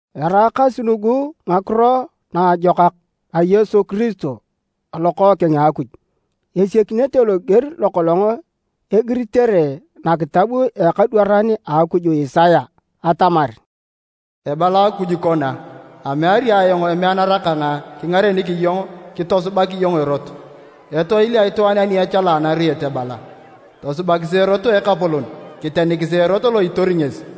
Eraakasi nugu Ngakiro Naajokak a Yesu Kiristo a Lokookeng a Akuj. Esiakinete loger lokolong egiritere nakitab a ekadwaran a Akuj Isaya atamar, “Ebala Akuj kona, ‘Ameari ayong emeanara kang kingarenik iyong kitosubak iyong erot!’ Etoil a itwaan ani echala anariet ebala, ‘Tosubakisi erot Ekapolon, kitenikisi erot lo itori ngesi!’”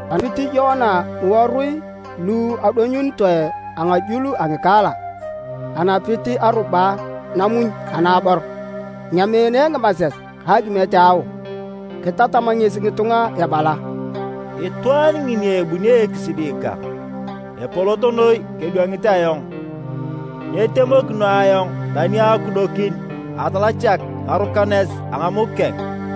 Anapit Yoana ngiworui lu adonyunitoe a ngajul a ngikaala. Anapit aruba namuny anaabor. Anyameene ngimases ka akimiet a ao. Kitatam ngesi ngitunga ebala, “Itwaan ngini ebuni ekisidi kang epolot noi kedwangit ayong, nyitemokino ayong tani akudokin atalachak ngarukanes a ngamuk keng.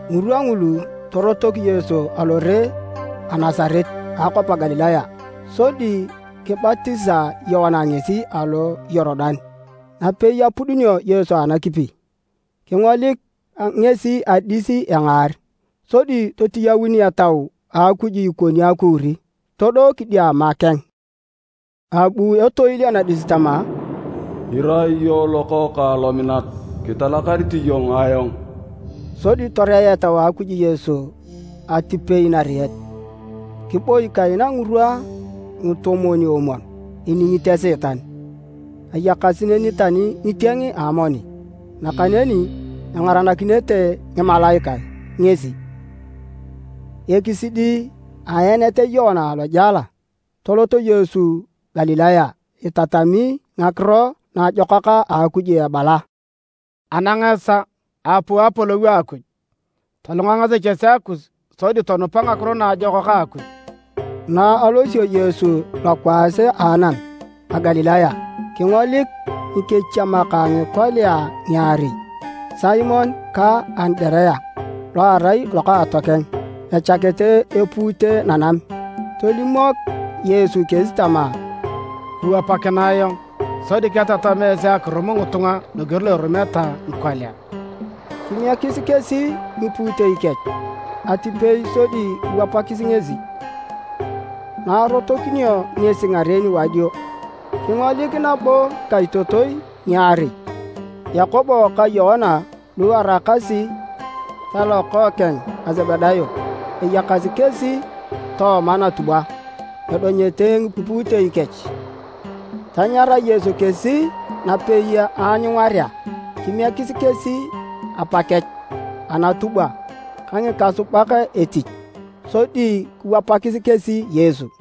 Ngirwa ngulu, torotok Yesu alore a Nasaret a akwap a Galilaya, sodi kibatisa Yoana ngesi alo Yorudan. Napei apudunio Yesu anakipi, kingolik ngesi adis engaar, sodi totiyaun Etau a Akuj ikoni akuuri todo kidiama keng. Abu etoil anadis tama, “Irai iyong Lokookang lominat. Kitalakarit iyong ayong.” Sodi toreea Etau a Akuj Yesu atipei nariet, kiboi kaina ngirwa ngitomwon-omwon iningit Esiitan. Ayakasi neni tani ngitieng a amoni, nakaneni engaranakinete ngimalaikae ngesi. Ekisidi a aenet a Yoana alojela, tolot Yesu Galilaya, itatami Ngakiro Naajokak a Akuj ebala, “Anang esaa, aapuu Apolou a Akuj! Tolunga ngasechesea kus sodi tonupa Ngakiro Naajokak a Akuj!” Na alosio Yesu alokwaas a anam a Galilaya, kingolik ngikechiemak a ngikolia ngiarei, Simon ka Andirea lo arai lokaatokeng, echakete epuute nanam. Tolimok Yesu kesi tama, “Kiwapakinae ayong sodi ketatam esi akirum ngitunga loger lo irumeta ngikolia.” Kimiekis kesi ngipuutei kech atipei sodi kiwapakis ngesi. Na arotokinio ngesi ngaren wadio, kingolik nabo ngikaitotoi ngiarei, Yakobo ka Yoana lu eraakasi talokookeng a Sebedayo. Ayakasi kesi tooma natubwa edonyete ngipuutei kech. Tanyara Yesu kesi napei aanyungarea. Kimiekis kesi apa kech anatubwa ka ngikasubak etich, sodi kiwapakis kesi Yesu.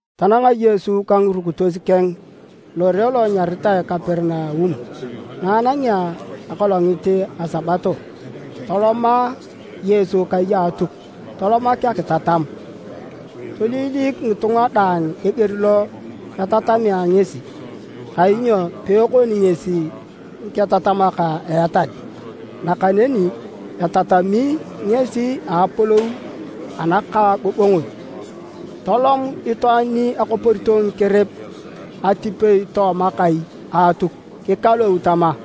Tananga Yesu ka ngirukitos keng lore lo anyaritae Kaperinaum. Na anangea akolongit a Sabato, toloma Yesu kai a Atuk tolomak akitatam. Toiliilik ngitunga daang eger lo etatamea ngesi, kainyo peekoni ngesi ngiketatamak a etal, nakaneni etatami ngesi a Apolou anakaagongon. Tolom itwaan ni akoporito ngikerep atipei tooma kai a Atuk kikalou tama,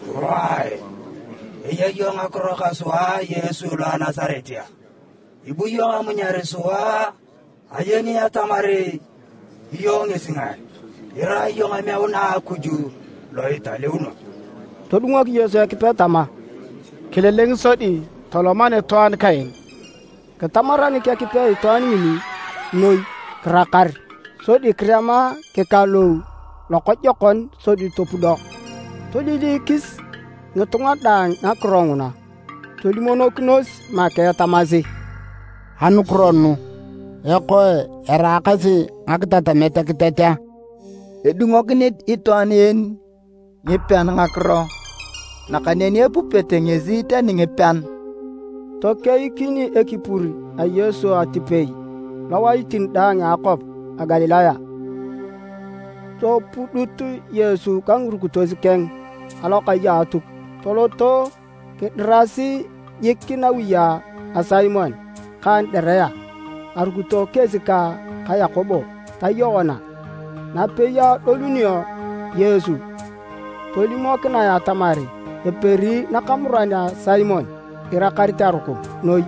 “Wae! Eya iyong ngakiro ka sua Yesu lo a Nasaret a? Ibu iyong amunyar sua a? Ayeni atamar iyong ngesi ngae, irai iyong emeuna a Akuj lo italeuno!” Todungok Yesu Ekipe tama, “Kililing sodi tolom anitwaan kaen!” Kitamaranik Ekipe itwaan ngini noi kirakar. Sodi kirema kikalou lokojokon, sodi topudo. Toiliilikis ngitunga daang ngakiro nguna tolimonokinos make tamasi, “Anukiro nugu? Ekoe, eraakasi ngakitatamet kiteat a? Edungonokini itwaan en ngipean ngakiro nakaneni epupete ngesi tani ngipean!” Tokeikin ekipur a Yesu atipei lowaitin daang a akwap a Galilaya. Topudut Yesu ka ngirukitos keng alokai a Atuk toloto kidirasi jik nawi a Simon ka Andirea. Arukito kesi ka Yakobo ta Yoana. Napei adolunio Yesu tolimokinae atamar eperi nakamuran a Simon irakarit arukum noi.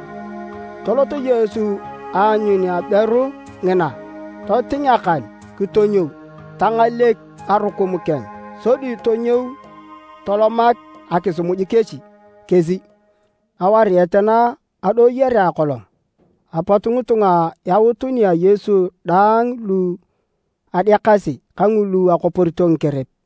Tolot Yesu aanyun aberu ngina, toting akan kitonyou. Tangalek arukum keng. Sodi tonyou tolomak akisimuj kesi. Awariet na adoyorea akolong, apot ngitunga yaut nia Yesu daang lu adeakasi ka ngulu akoporito ngikerep.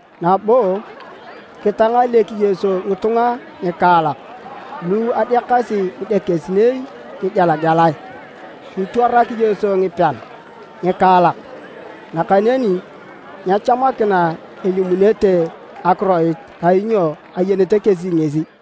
Nabo kitangalek Yesu ngitunga ngikaalak lu adeakasi ngidekesinei ngigelagelae. Kitwarak Yesu ngipean ngikaalak. Nakaneni nyechamakina elimunete akiroit kainyo ayenete kesi ngesi.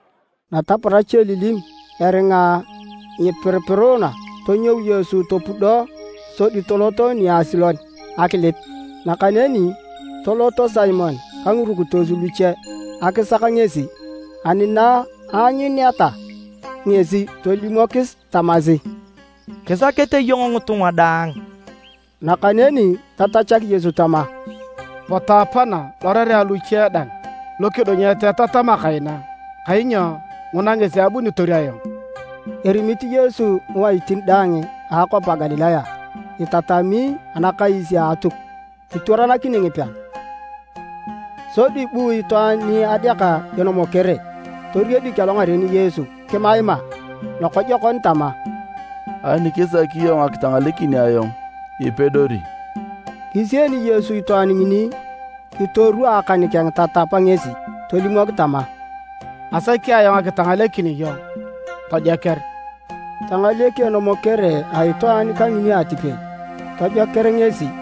Nataparach elilim, eringa nyipiripiruna, tonyou Yesu topudo sodi tolot niasilon akilip. Nakaneni toloto Simon ka ngirukitos luche akisak ngesi, ani na anyuneta ngesi, tolimokis tamasi, “Kisakete iyong ngitunga daang.” Nakaneni tatachak Yesu tama, “Potu apana lorerea luche dang lukidunyet etatama kaina, kainyo nguna ngesi abunitor ayong.” Erimit Yesu ngiwaitin daang a akwap a Galilaya itatami anakais a Atuk, kitwaranakini ngipean. Sodi bu itwaan ni adeaka enomokere toriedik alongaren Yesu kimaima lokojokon tama, “Ani kisaki iyong akitangalekin ayong, ipedori.” Kisieni Yesu itwaan ngini kitorwaa akan keng tatap ngesi. Tolimok tama, “Asaki ayong akitangalekin iyong, tojoker!” Tangalek enomokere a itwaan kangini atipei, tojoker ngesi.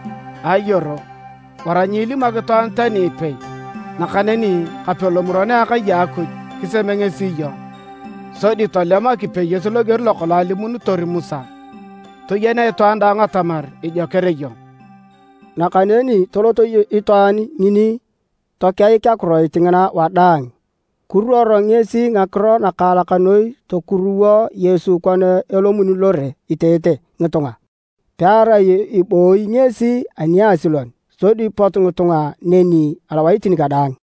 “Ayoro, wara nyiilimok itwaan tani ipei, nakaneni kape lomuron a akai a Akuj kiseme ngesi iyong. Sodi tolem akipeyoet loger lokolong alimunitor Musa, toyenea itwaan daang atamar ijoker iyong.” Nakaneni tolot itwaan ngini tokeik akiroit ngina wadaang. Kiruor ngesi ngakiro nakaalak noi tokuruwo Yesu kona elomuni lore iteete ngitunga, pearai ebooyi ngesi aniasilon, sodi pot ngitunga neni alowaitin kadaang.